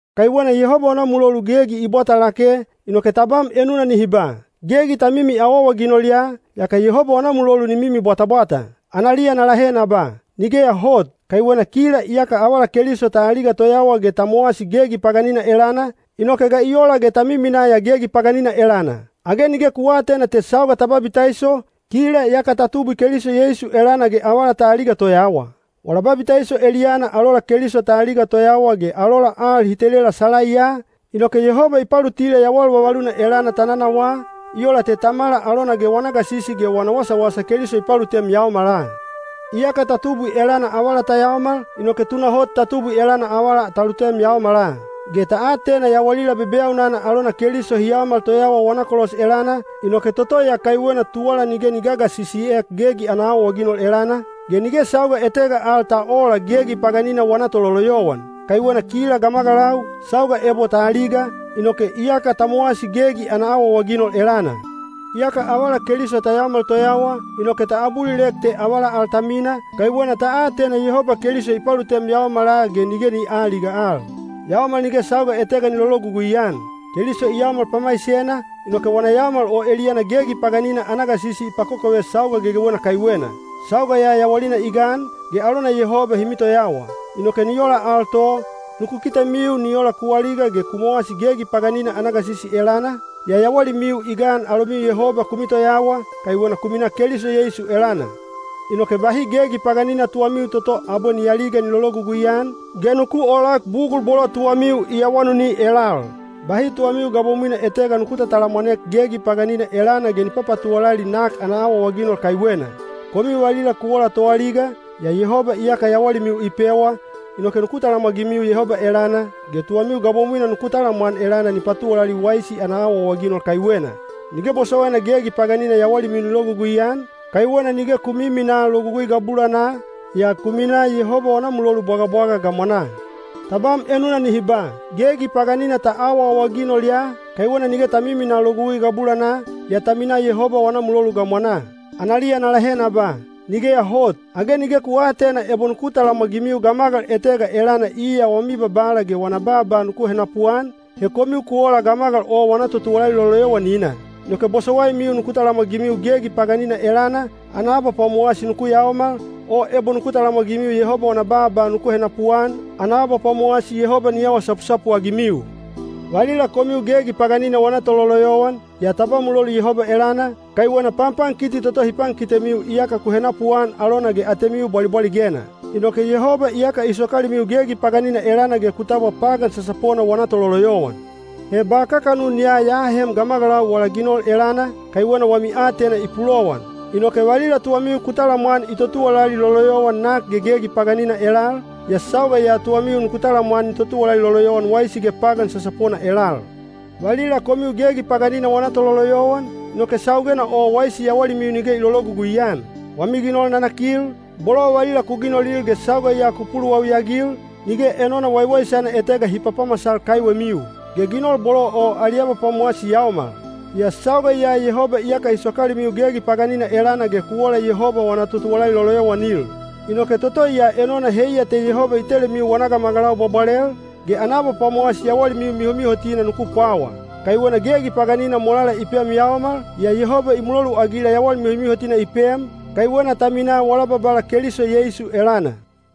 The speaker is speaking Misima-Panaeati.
Kaiwena Yehoba wana mulolu gegi i bwata lake, inoke tabam enuna nihi ba, “Gegi ta mimi awaawaginol ya, yaka Yehoba wana mulolu ni mimi bwatabwata.” Analiya na lahe na ba, “Nigeya hot!” Kaiwena kila iyaka avala Keliso ta aliga toyawa ge ta mowasi gegi paganina elana, inoke ga i ola ge ta miminaa ya gegi paganina elana? Age nige ku aatena te sauga ta babitaiso, kila yaka ta tubwi Keliso Yeisu elana ge avala ta aliga toyawa? Wala babitaiso eliyana alola Keliso ta aliga toyawa ge alola al hi telela salaiya, inoke Yehoba i palutila yawal vavaluna elana ta nanawaa, i ola te Tamala alona ge wana gasisi ge wana wasawasa Keliso i palutem yaomala. Iyaka ta tubwi elana avala ta yaomal, inoke tunahot ta tubwi elana avala ta lutem yaomala. Ge ta atena yawalila bebeyaunana alona Keliso hi yaomal toyawa wana kolos elana, inoke toto ya kaiwena tuwala nige ni gagasisiek gegi ana awaawaginol elana, ge nige sauga etega al ta oola gegi paganina wana tololoyowan. Kaiwena kila gamagalau, sauga ebo ta aliga, inoke iyaka ta mowasi gegi ana awaawaginol elana. Iyaka avala Keliso ta yaomal toyawa, inoke ta abulilek te avala al ta mina, kaiwena ta atena Yehoba Keliso i palutem yaomala ge nige ni aaliga al. Yaomal nige sauga etega ni lologugui-an. Keliso i yaomal pamaisena, inoke wana yaomal o eliyana gegi paganina ana gasisi i pakokove sauga gegewena kaiwena. Sauga ya yawalina i gan, ge alona Yehoba hi mitoyawa. Inoke ni ola al to, nuku kitemiu ni ola ku aliga ge ku mowasi gegi paganina ana gasisi elana, yaa yawalimiu i gan alomiu Yehoba ku mitoyawa, kaiwena ku minaa Keliso Yeisu elana. Inoke bahi gegi paganina tuwamiu toto abwe ni aliga ni lologugui-an, ge nuku oolak bugul bolo tuwamiu i awanuni elal. Bahi tuwamiu gabomwina etega nuku tatalamwanek gegi paganina elana ge ni papatuwalali nak ana awaawaginol kaiwena. Komiu valila ku ola toaliga, yaa Yehoba iyaka yawalimiu i pewa, inoke nuku talamwagimiu Yehoba elana, ge tuwamiu gabomwina nuku talamwan elana ni patuwalali waisi ana awaawaginol kaiwena. Nige bosowaina gegi paganina yawalimiu ni logugui-an, kaiwena nige ku miminaa Logugui gabulanaa, yaa ku minaa Yehoba wana mulolu bwagabwaga gamwanaa. Tabam enuna nihi ba, “Gegi paganina ta awaawaginol ya, kaiwena nige ta miminaa Logugui gabulanaa, yaa ta minaa Yehoba wana mulolu gamwanaa.” Analiya na lahe na ba, “Nigeya hot!” Age nige ku aatena ebo nuku talamwagimiu gamagal etega elana iya wami babala ge wana baaba nuku henapuan, he komiu ku ola gamagal o wana totuwalali loloyowanina? Inoke bosowaimiu nuku talamwagimiu gegi paganina elana, ana abapwamowasi nuku yaomal, o ebo nuku talamwagimiu Yehoba wana baaba nuku henapuan, ana abapwamowasi Yehoba ni awa sapusapu-agimiu. Valila komiu gegi paganina wana tololoyowan, yaa ta ba mulolu Yehoba elana, kaiwena panpankiti toto hi pankitemiu iyaka ku henapuan alona ge atemiu bwalibwaligena. Inoke Yehoba iyaka i sokalimiu gegi paganina elana ge ku tabwa pagan sasapona wana tololoyowan. He ba kakanun ya ya ahem gamagalau wala ginol elana, kaiwena wami aatena i pulowan. Inoke valila tuwamiu ku talamwan i totuwalali loloyowan nak ge gegi paganina elal, yaa sauga ya tuwamiu nuku talamwan ni totuwalali loloyowan waisi ge pagan sasapona elal. Valila komiu gegi paganina wana tololoyowan, inoke saugena o waisi yawalimiu nige i lologugui-an. Wami ginol nanakil, bolo valila ku ginolil ge sauga ya ku puluwawi-agil, nige enona waiwaisana etega hi papamasal kaiwemiu. Ge ginol bolo o ali abapwamowasi yaomal. Yaa sauga ya Yehoba iyaka i sokalimiu gegi paganina elana ge ku ola Yehoba wana totuwalali loloyowanil. Inoke toto ya enona heiya te Yehoba i telemiu wana gamagalau bwabwalel, ge ana abapwamowasi yawalimiu mihomihotina nuku pwawa. Kaiwena gegi paganina molala i pem yaomal, yaa Yehoba i muloluagila yawal mihomihotina i pem, kaiwena ta minaa wala Babala Keliso Yeisu elana.